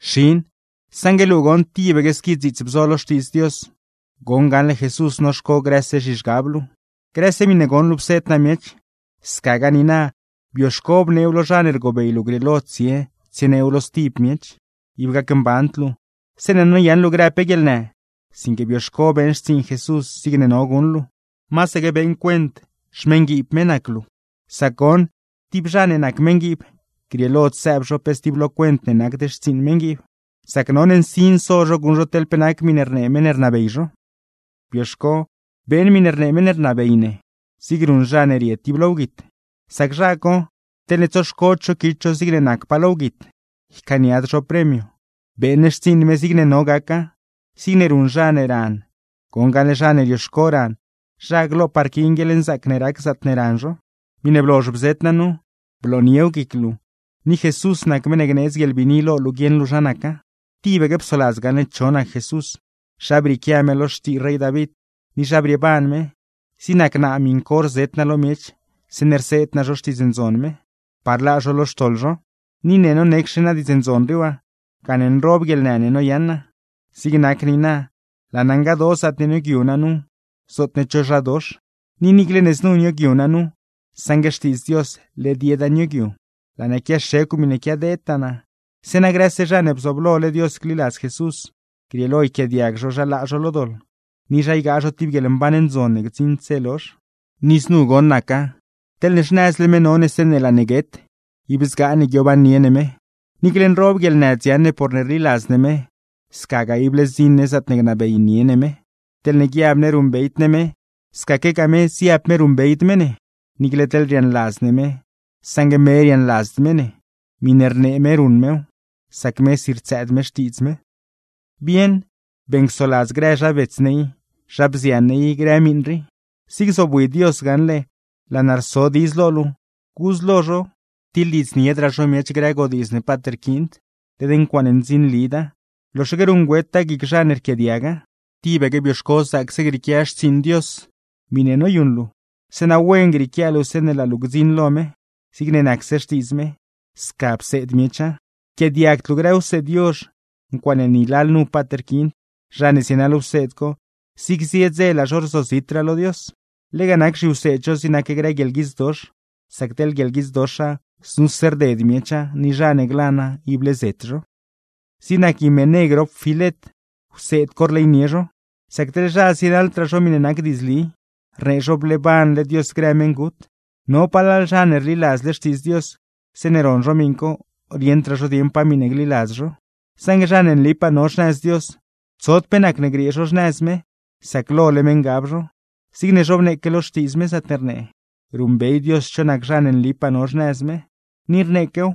Xin, saṉgue luu goṉ tibaque squi dziits bzo lo Xtiidz Dios, goṉ gaṉle Jesús noxco grëse zhizhgab luu. Grëse miṉe goṉ luu pseed naa miech, scagaa niina bioxco bneew lo zha ne rgobey luu grieelo tsie tsieneew lo stib miech. Ib gacmband luu zeeṉe noyaṉ luu grë pe guieḻnë, sinque bioxco beeṉ xtsiiṉ Jesús zigne no guṉ luuw, masaque beeṉ cuent xmeṉguiib me nac luu. Sac goṉ, tib zha ne nac meṉguiib, grieelod sëëb zho pe stib lo cuent ne nacd xtsiiṉ meṉguiib, sac none nsin so zho guṉ zho teḻ pe nac miṉe rnee meṉ ne rnabey zho. Bioxco beeṉ miṉe rnee meṉ ne rnabey ne, zig ruṉ zha ne rie tib lo wguit; sac zha co teḻne tsoxcod zho quit zho zigne nacpaa lo wguit, ycaaniad zho premio. Beeṉ xtsiiṉ me zigne no gaca, zig ruṉ zha ne ran; goṉ gaṉle zha ne rioxco ran, zha glopaa rquiin guieḻnzaac ne rac zaatne ran zho. Miṉe blozh bzet naa nu, blooniew guic luu, ni Jesús nac meṉ ne gneedz guieḻbiini lo luu guieṉ luu zha naca. Tibaque psoladz gaṉle cho nac Jesús, zha brieequia me lo xtii rey David, ni zha brieeban me; zig nac naa miṉ co rzet naa lo miech zeeṉe rseed naa zho Xtiidz Ndzon me, par laa zho lo xtoḻ zho. Ni ne nonecxe naa Diidz Ndzon rii waa, gane nroob guieḻnë ne noyaṉ naa; zig nac niina, laa naa ngadoo zaatne nioogyu naa nu zootne cho zha dox. Ni niicle ne znu nioogyu naa nu, saṉgue Xtiidz Dios led yeda nioogyu. Laa naa quiaxecw miṉe quiadeedtaa naa, zeeṉa grëse zha ne bzooblole Dios gliladz Jesús, grieelo yquiaadiag zho zha laa zho lo doḻ, ni zha ygaa zho tib guieḻmban ndzon ne gdziṉd dze lozh. Ni znu goṉ naca: Teḻne xnëzle me no ne zeeṉe laa ne guet, ib zgaa ne guiobannie ne me. Niicle nroob guieḻnë dziaṉ ne porne rliladz ne me, scagaa ible zdziṉ ne zaatne gnabeynie me ne; teḻne guiab ne ruṉbeyd ne me, scaquegaa me ziab me ruṉbeyd me ne. Niicle teḻne riaaṉladz ne me, saṉgue me riaaṉladzd me ne; miṉe rnee me ruṉ mew, sac mesi rtsëëd me xtiidz me. Bieṉ, beeṉcsoladz grë zha bets ne i, zha bzian ne i grë miṉ rii. Zig zobwi Dios gaṉle laa naa rso diidz lo luu, gudz lo zho tiḻdiidzniedraa zho miech grë godiidz ne paat rquiind; led ncuaaṉe ndzinlida, loxaque ruṉgüeta guic zha ne rquiaadiaga. Tibaque bioxco zaacse grieequia xtsiiṉ Dios, miṉe noyuṉ luu, zeeṉa wen grieequia luu zeeṉe laa luu gdziṉ lo me. Zigne nacse Xtiidz me, sca pseed miecha. Yquiaadiagd luu grë wseed yozh, ncuaaṉe ni lalnu paat rquiind; zha ne zienaḻ wseed co, zig zie dze laa zho rzozitraa lo Dios. Lega nac zhiwseed zho zig nac grë guieḻguidzdox; sac teḻ guieḻguidzdoxa, znuse rded miecha ni zha ne glana ible zet zho. Zig nac Himené grop Filet, wseed co rleynie zho, sac teḻ zha zienaḻdraa zho miṉe nac diidzli; rnee zho bleebanle Dios grë meṉgut. No palal zha ne rliladzle Xtiidz Dios, zeeṉe ron zho miṉ co, rieṉdraa zho dieṉ pa miṉe gliladz zho. Saṉgue zha ne nlipaa no xnëz Dios, tsod pe nacne griee zho xnëz me sac lole me ngab zho; zigne zhobneeque lo Xtiidz me zaatne rnee: “Ruṉbey Dios cho nac zha ne nlipaa no xnëz me”; ni rneequew: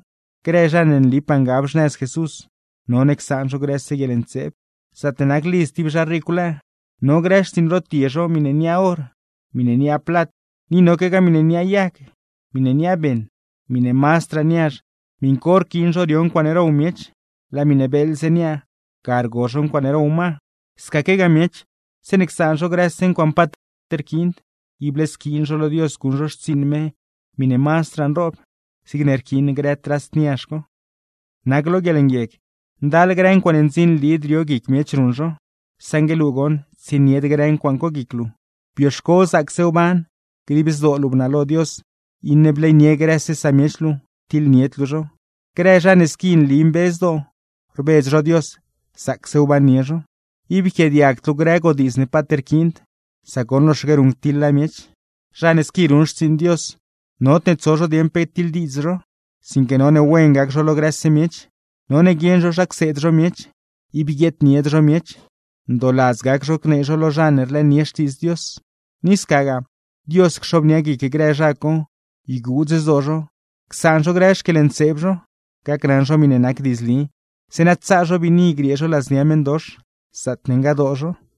“Grë zha ne nlipaa ngab xnëz Jesús, none csaan zho grëse guieḻntseeb.” Zaatne nac lidz tib zha ricw lëë, no grë xtsiiṉ rotie zho miṉe niaa or, miṉe niaa plat, ni noquegaa miṉe niaa yag, miṉe niaa beṉ. Miṉe mazdraa niazh, miṉ co rquiin zho rio ncuaaṉe row miech; laa miṉe beeḻze niaa, ga rgo zho ncuaaṉe row ma. Scaquegaa miech, zeeṉe csaan zho grëse ncuaaṉe paat rquiind, ible squiin zho lo Dios guṉ zho xtsiiṉ me miṉe mazdraa nroob, zigne rquiin grë trast niazh co. Nac lo guieḻnguieg, ndal grë ncuaaṉe ndzinlid rio guic miech ruṉ zho, saṉgue luu goṉ tsienied grë ncuaaṉ co guic luu, bioxco zaacse wban, dib zdoo luu bnalo Dios, iṉe bleynie grëse samiech luu, tiḻnied luu zho; grë zha ne squi nli mbe zdoo, rbedz zho Dios, zaacse wbannie zho. Ib yquiaadiagd luu grë godiidz ne paat rquiind, sac goṉ loxaque ruṉctiḻa miech. Zha ne squi ruṉ xtsiiṉ Dios, nodne tso zho dieṉ pe tiḻdiidz zho; sinque none wen gac zho lo grëse miech. None guieṉ zho zha cseed zho miech; ib guieednied zho miech, ndooladz gac zho gnee zho lo zha ne rlëënie Xtiidz Dios. Ni scagaa Dios cxobnia guic grë zha co, yguudz zdoo zho csaan zho grë xquieḻntseeb zho, gacnaṉ zho miṉe nac diidzli; zeeṉa tsaa zho biini griee zho ladznia meṉdox, zaatne ngadoo zho.